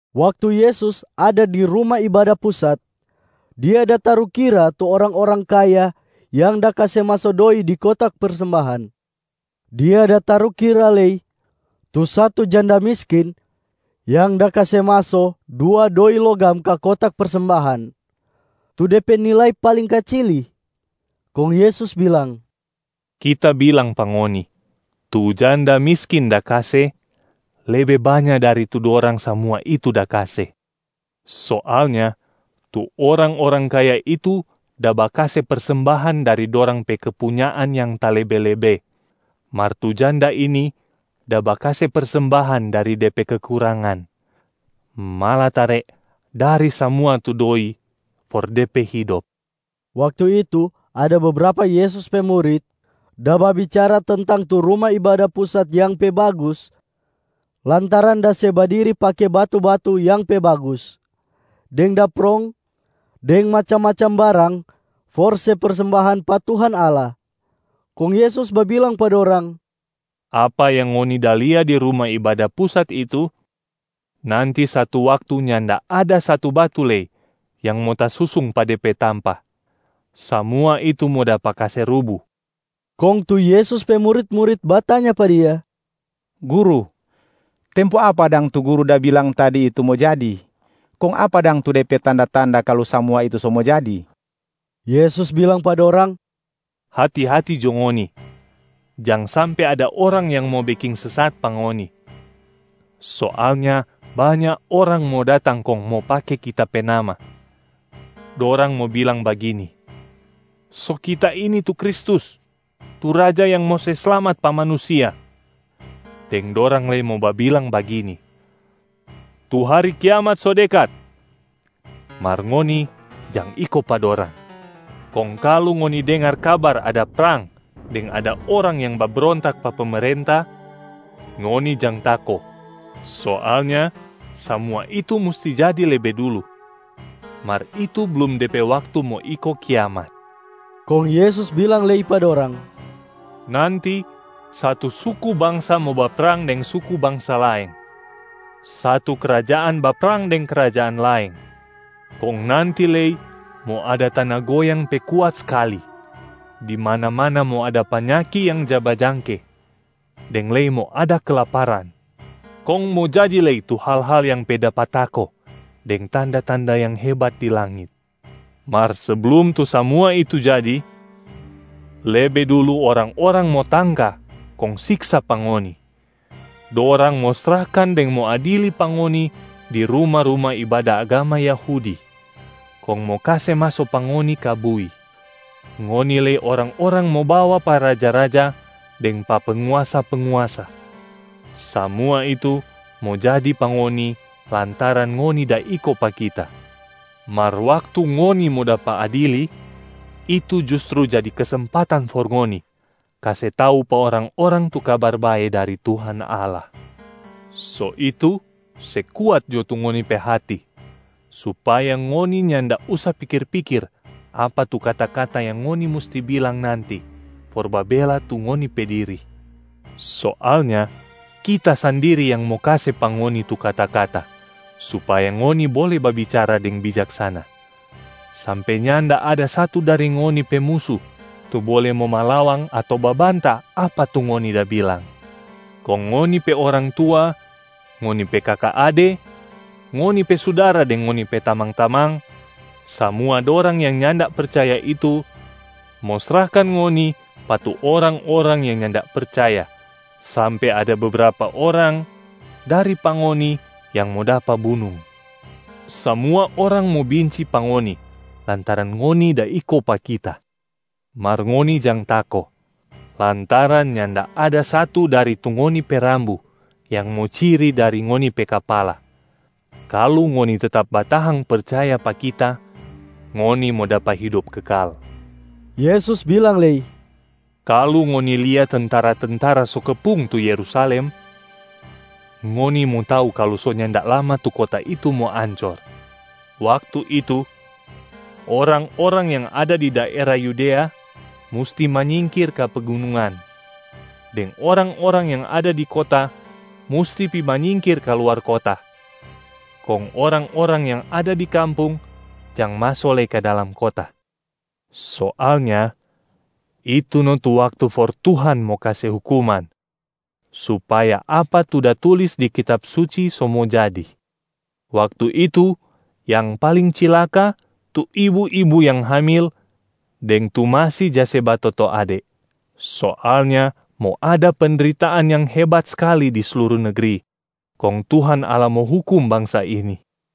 Waktu Yesus ada di Ruma Ibada Pusat, Dia da tarukira tu orang-orang kaya yang da kase maso doi di kotak persembahan. Dia da tarukira lei tu satu janda miskin yang da kase maso dua doi logam ka kotak persembahan, tu de pe nilai paling kacili. Kong Yesus bilang, “Kita bilang pa ngoni, tu janda miskin da kase lebe banya dari tu dorang samua itu da kase. Soalnya tu orang-orang kaya itu da bakase persembahan dari dorang pe kepunyaan yang talebe-lebe, mar tu janda ini da bakase persembahan dari de pe kekurangan, malatare dari samua tu doi for de pe hidop.” Waktu itu ada bebrapa Yesus pe murit da babicara tentang tu Ruma Ibada Pusat yang pe bagus lantaran da se badiri pake batu-batu yang pe bagus, deng da prong deng macam-macam barang for se persembahan pa Tuhan Allah. Kong Yesus babilang pa dorang, “Apa yang ngoni da lia di Ruma Ibada Pusat itu, nanti satu waktu nyanda ada satu batu lei yang mo tasusung pa de pe tampa, samua itu mo dapa kase rubu.” Kong tu Yesus pe murit-murit batanya pa Dia, “Guru, tempo apa dang tu Guru da bilang tadi itu mo jadi? Kong apa dang tu de pe tanda-tanda kalu samua itu so mo jadi?” Yesus bilang pa dorang, “Hati-hati jo ngoni, jang sampe ada orang yang mo beking sesat pa ngoni. Soalnya banya orang mo datang kong mo pake Kita pe nama. Dorang mo bilang bagini, ‘So kita ini tu Kristus, tu Raja yang mo se slamat pa manusia!’ Deng dorang lei mo babilang bagini, ‘Tu hari kiamat so dekat!’ Mar ngoni jang iko pa dorang. Kong kalu ngoni dengar kabar ada prang deng ada orang yang babrontak pa pemerenta, ngoni jang tako. Soalnya samua itu musti jadi lebe dulu, mar itu blum de pe waktu mo iko kiamat.” Kong Yesus bilang lei pa dorang, “Nanti satu suku bangsa mo baprang deng suku bangsa laeng, satu krajaan baprang deng krajaan laeng. Kong nanti lei mo ada tana goyang pe kuat skali, di mana-mana mo ada panyaki yang ja bajangke, deng lei mo ada kelaparan. Kong mo jadi lei tu hal-hal yang pe dapa tako deng tanda-tanda yang hebat di langit. Mar seblum tu samua itu jadi, lebe dulu orang-orang mo tangka kong siksa pa ngoni. Dorang mo srahkan deng mo adili pa ngoni di ruma-ruma ibada agama Yahudi, kong mo kase maso pa ngoni ka bui. Ngoni lei orang-orang mo bawa pa raja-raja deng pa penguasa-penguasa. Samua itu mo jadi pa ngoni lantaran ngoni da iko pa Kita. Mar waktu ngoni mo dapa adili, itu justru jadi kesempatan for ngoni kase tau pa orang-orang tu Kabar Bae dari Tuhan Allah. So itu se kuat jo tu ngoni pe hati supaya ngoni nyanda usa pikir-pikir apa tu kata-kata yang ngoni musti bilang nanti for babela tu ngoni pe diri. Soalnya Kita sandiri yang mo kase pa ngoni tu kata-kata supaya ngoni bole babicara deng bijaksana, sampe nyanda ada satu dari ngoni pe musu tu bole mo malawang ato babanta apa tu ngoni da bilang. Kong ngoni pe orang tua, ngoni pe kaka ade, ngoni pe sudara deng ngoni pe tamang-tamang, samua dorang yang nyanda percaya itu mo srahkan ngoni pa tu orang-orang yang nyanda percaya sampe ada bebrapa orang dari pa ngoni yang mo dapa bunung. Samua orang mo binci pa ngoni lantaran ngoni da iko pa Kita. Mar ngoni jang tako lantaran nyanda ada satu dari tu ngoni pe rambu yang mo ciri dari ngoni pe kapala.a Kalu ngoni tetap batahang percaya pa Kita, ngoni mo dapa hidop kekal.” Yesus bilang lei, “Kalu ngoni lia tentara-tentara so kepung tu Yerusalem, ngoni mo tau kalu so nyanda lama tu kota itu mo ancor. Waktu itu orang-orang yang ada di daera Yudea musti manyingkir ka pegunungan. Deng orang-orang yang ada di kota musti pi manyingkir ka luar kota, kong orang-orang yang ada di kampung jang maso lei ka dalam kota. Soalnya itu no tu waktu for Tuhan mo kase hukuman, supaya apa tu da tulis di Kitab Suci so mo jadi. Waktu itu yang paling cilaka tu ibu-ibu yang hamil deng tu masi ja se batoto ade. Soalnya mo ada pendritaan yang hebat skali di sluru negri, kong Tuhan Allah mo hukum bangsa ini.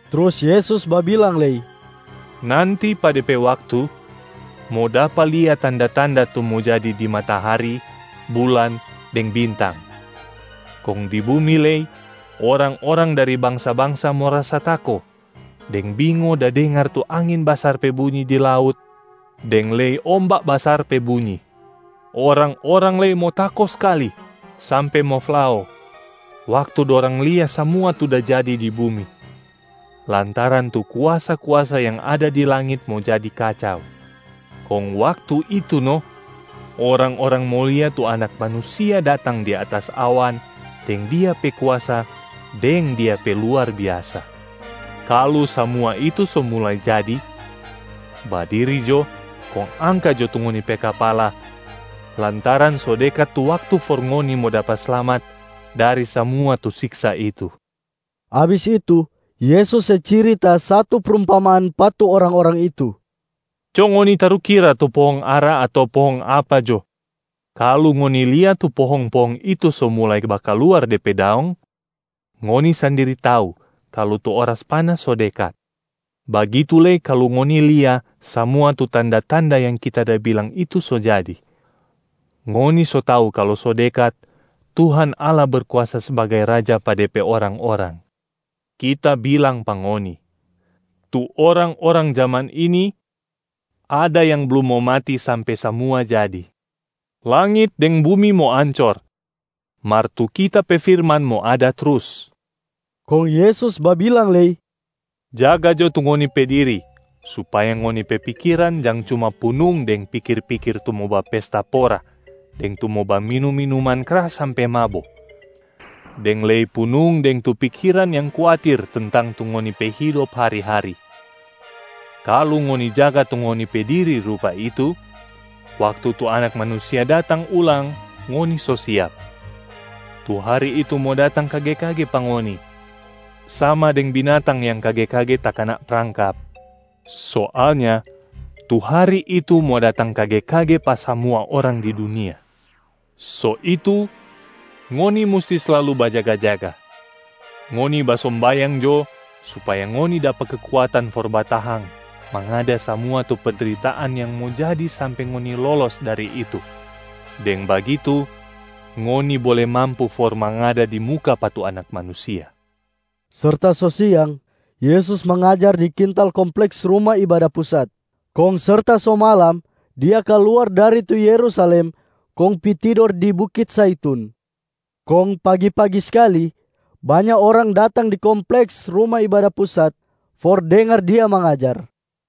Trus Yesus babilang lei, “Nanti pa de pe waktu, mo dapa lia tanda-tanda tu mo jadi di matahari, bulan deng bintang. Kong di bumi lei orang-orang dari bangsa-bangsa mo rasa tako deng bingo da dengar tu angin basar pe bunyi di laut deng lei omba basar pe bunyi. Orang-orang lei mo tako skali sampe mo flao waktu dorang lia samua tu da jadi di bumi, lantaran tu kuasa-kuasa yang ada di langit mo jadi kacau. Kong waktu itu no orang-orang mo lia tu Anak Manusia datang di atas awan deng Dia pe kuasa deng Dia pe luar biasa. Kalu samua itu so mulai jadi, badiri jo kong angka jo tu ngoni pe kapala lantaran so dekat tu waktu for ngoni mo dapa slamat dari samua tu siksa itu.” Abis itu, Yesus se cirita satu prumpamaan pa tu orang-orang itu, “Co ngoni tarukira tu pohong ara ato pohong apa jo. Kalu ngoni lia tu pohong-pohong itu so mulai bakaluar de pe daong, ngoni sandiri tau kalu tu oras panas so dekat. Bagitu lei kalu ngoni lia samua tu tanda-tanda yang Kita da bilang itu so jadi, ngoni so tau kalu so dekat Tuhan Allah Berkuasa sbagai Raja pa De pe orang-orang. Kita bilang pa ngoni, tu orang-orang jaman ini ada yang blum mo mati sampe samua jadi. Langit deng bumi mo ancor, mar tu Kita pe firman mo ada trus.” Kong Yesus babilang lei, “Jaga jo tu ngoni pe diri supaya ngoni pe pikiran jang cuma punung deng pikir-pikir tu mo bapesta pora deng tu mo baminum minuman kras sampe mabo, deng lei punung deng tu pikiran yang kuatir tentang tu ngoni pe hidop hari-hari. Kalu ngoni jaga tu ngoni pe diri rupa itu, waktu tu Anak manusia datang ulang ngoni so siap. Tu hari itu mo datang kage-kage pa ngoni, sama deng binatang yang kage-kage takana prangkap. Soalnya tu hari itu mo datang kage-kage pa samua orang di dunia. So itu ngoni musti slalu bajaga-jaga! Ngoni basombayang jo supaya ngoni dapa kekuatan for batahang mangada samua tu pendritaan yang mo jadi sampe ngoni lolos dari itu. Deng bagitu ngoni bole mampu for mangada di muka pa tu Anak Manusia.” Serta so siang Yesus mangajar di kintal kompleks Ruma Ibada Pusat, kong serta so malam Dia kaluar dari tu Yerusalem kong pi tidor di bukit Zaitun. Kong pagi-pagi skali, banya orang datang di kompleks Ruma Ibada Pusat for dengar Dia mangajar.